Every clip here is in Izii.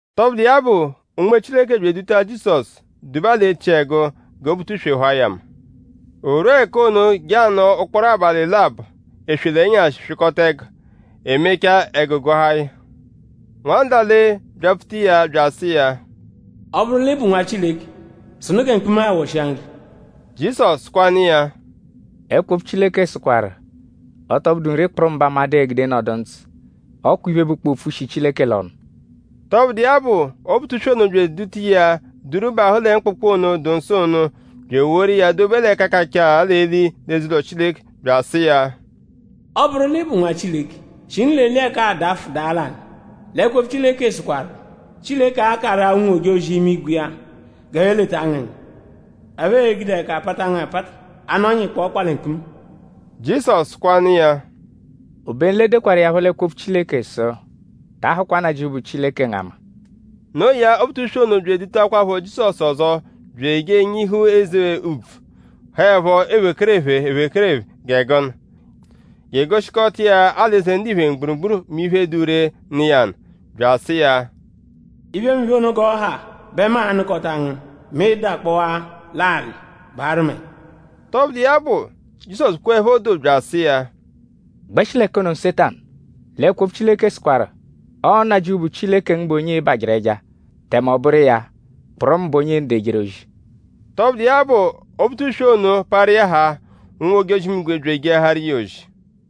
Tọbudu iya bụ; Unme Chileke bya eduta Jizọsu duba l'echiẹgu gẹ Obutuswe hụa ya ama. O rwua ẹka ono je anọo ụkporo abalị labọ: eswe l'ẹnyashi; swịkota ẹgu. E mechaa; ẹgu gụahaa ya. Nwandale byapfuta iya bya asụ iya: “Ọ -bụru l'ị bụ Nwa Chileke; sụnu gẹ mkpuma-a ghọshia nri!” Jizọsu sụkwanu iya: “Ẹkwo-opfu Chileke sụkwaru: ‘Ọ tọ bụdu nri kpụrumu bẹ amadụ e-gude nọdu ndzụ. Ọ kwa iphe, bụkpoo opfu, shi Chileke l'ọnu.’” Tọbudu iya bụ; Obutuswe ono bya eduta iya duru bahụ lẹ mkpụkpu ono, dụ nsọ ono, bya eworu iya dobe l'ẹka kachaa l'eli l'eze-ụlo Chileke bya asụ iya: “Ọ -bụru l'ị bụ Nwa Chileke; shinu l'eli ẹka-a dafụ daa l'alị; l'ẹkwo-opfu Chileke sụkwaru: “Chileke a-karụ-a ụnwu-ojozi-imigwe iya g'ẹphe leta ngu ẹnya. ‘Ẹphe e-gude ẹka pata ngu apata; a nọnyaa ị kpọo ọkpa lẹ mkpuma.’” Jizọsu sụkwanu iya: “Obenu l'e dekwaru iya phọ l'ẹkwo-opfu Chileke sụ: ‘Ta ahụkwa Nnajịuphu, bụ Chileke ngu ama.’” Noo ya; Obutuswe ono bya edutakwaphọ Jizọsu ọzo bya eje enyihu eze úbvú, haẹpho ephekerephe ephekerephe gẹ gụnu; je egoshikọta iya alị-eze ndiphe mgburugburu mẹ iphe, dụ ree, nọ iya nụ. Bya asụ iya: “Iphemiphe ono g'ọ ha bẹ mu a-nụkota ngu mẹ ị -dakpọwaa l'alị; baarụ mu ẹja.” Tọbudu iya bụ; Jizọsu kweẹpho doo bya asụ iya: “Gbẹshi l'ẹka ono Nsetanu; l'ẹkwo-opfu Chileke sụkwaru: ‘Ọo Nnajịuphu, bụ Chileke ngu bụ onye ịi-barụ ẹja; tẹme ọ bụru iya kpụrumu bụ onye ịi-nọdu ejeru ozi.’” Tọbudu iya bụ; Obutuswe ono parụ iya haa; ụnwu-ojozi-imigwe bya ejeahaaru iya ozi.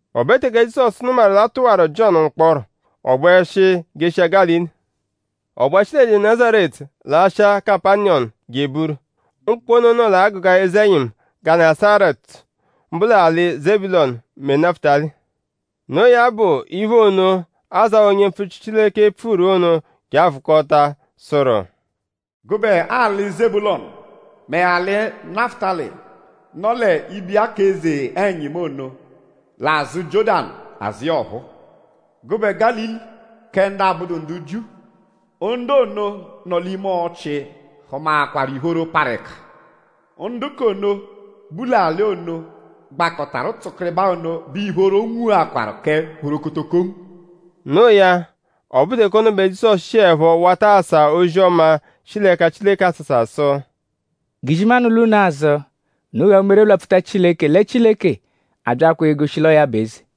O be teke Jizọsu nụmaru l'a tụwaru Jiọnu mkpọro; ọ gbẹshi jeshia Gálili. Ọ gbẹshi lẹ Nazaretu lashịa Kapaniyọmu je eburu. Mkpụkpu ono nọ l'agụga eze-ẹnyimu Gẹnesaretu; mbụ l'alị Zebulọnu mẹ Nafụtali. Noo ya bụ iphe ono, Azáya onye mpfuchiru Chileke pfuru ono je a-vụkota, sụru: “Gụbe alị Zebulọnu mẹ alị Nafụtali, nọ l'ibiya k'eze-ẹnyimu ono; l'azụ Jiọ́danu azụ iya ọphuu. Gụbe Gálili kẹ ndu abụdu ndu Jiu! Ndu ono, nọ l'ime ọchii hụmaakwaru ìphóró, parụ ẹka. Ndu k'ono, bu l'alị ono, gbakọtaru tsụkiribaa ono bẹ ìphóró nwuakwarụ kẹ phorokotokongu.” Noo ya; ọ bụru teke ono bẹ Jizọsu shiẹpho wata asa ozi-ọma, shi l'ẹka Chileke asasa sụ: “G'izimanụ lwa unu azụ; unu ghaa umere byapfuta Chileke lẹ Chileke abyaakwaa egoshi l'ọo ya bụ eze!”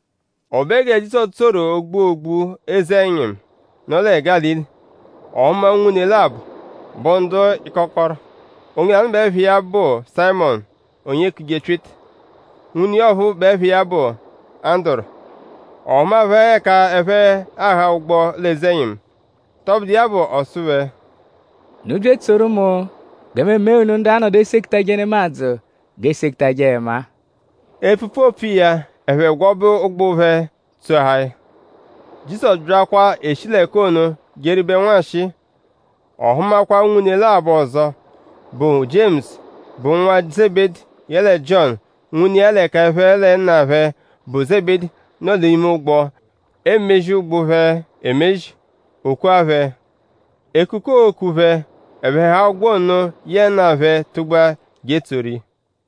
O be gẹ Jizọsu tsoru ógbú ógbú eze-ẹnyimu, nọ lẹ Gálili; ọ hụma unwune labọ, bụ ndu ịkokoro. Onye lanụ bẹ ẹpha iya bụ Sayịmonu, onye eekuje Pyịta. Nwune iya ọphuu bẹ ẹpha iya bụ Anduru. Ọ hụma phẹ ẹka ẹphe agha ụgbu l'eze-ẹnyimu. Tọbudu iya bụ; ọ sụ phẹ: “Unu bya etsoru mu gẹ mu emee unu ndu a-nọdu esekutaje nemadzụ g'eesetajẹ ẹma-a.” Epfupfu, oopfu iya; ẹphe gwọbe ụgbu phẹ; tsoahaa ya. Jizọsu byakwa eshi l'ẹka ono jeribẹru nwanshịi; ọ hụmakwa unwune labọ ọzo, bụ Jiemusu, bụ nwa Zebedi; yẹle Jiọnu nwune iya l'ẹka ẹphe lẹ nna phẹ, bụ Zebedi nọ l'ime ụgbo; emezi ụgbu phẹ emezi. O kua phẹ. Ekuku, ooku phẹ; ẹphe haa ụgbo ono yẹe nna phẹ tụgbua je etsoru iya.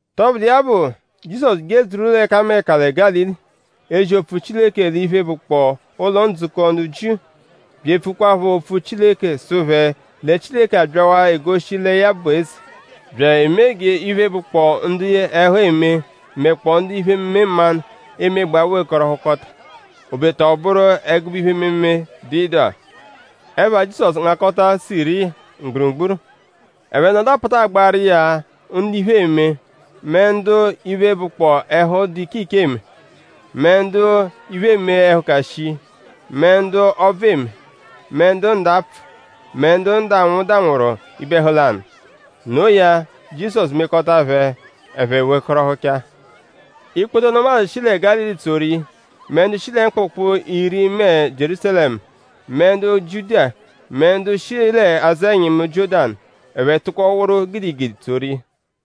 Tọbudu iya bụ; Jizọsu jedzuru ẹkameka lẹ Gálili; ezi opfu Chileke l'iphe, bụkpoo ụlo-ndzukọ ndu Jiu; bya epfukwaphọ opfu Chileke sụ phẹ lẹ Chileke abyawaa egoshi lẹ ya bụ eze; bya emee g'iphe, bụkpoo ndu ẹhu eme mẹkpoo ndu iphe-ememe mmanụ emegbaa wekọrohukota; obeta ọ bụru ẹgube iphe-ememe dụ ịdu-agha. Ẹpha Jizọsu ngakọta Siriya mgburugburu. Ẹphe nọdu apatagbaaru iya ndu iphe eme; mẹ ndu iphe, bụkpoo ẹhu, dụ iche iche eme; mẹ ndu iphe eme ẹhuka shii; mẹ ndu ọbvu eme; mẹ ndu ndapfụ; mẹ ndu ndanwụ danwụru ibe-ẹhu lanụ. Noo ya; Jizọsu mekọta phẹ; ẹphe wekọrohuchaa. Ikpoto nemadzụ shi lẹ Gálili tsoru iya; mẹ ndu shi lẹ Mkpụkpu-iri mẹ Jierúsalẹmu; mẹ ndu Jiudiya; mẹ ndu shi azụ ẹnyimu Jiọ́danu. Ẹphe tụko wụru gidigidi tsoru iya.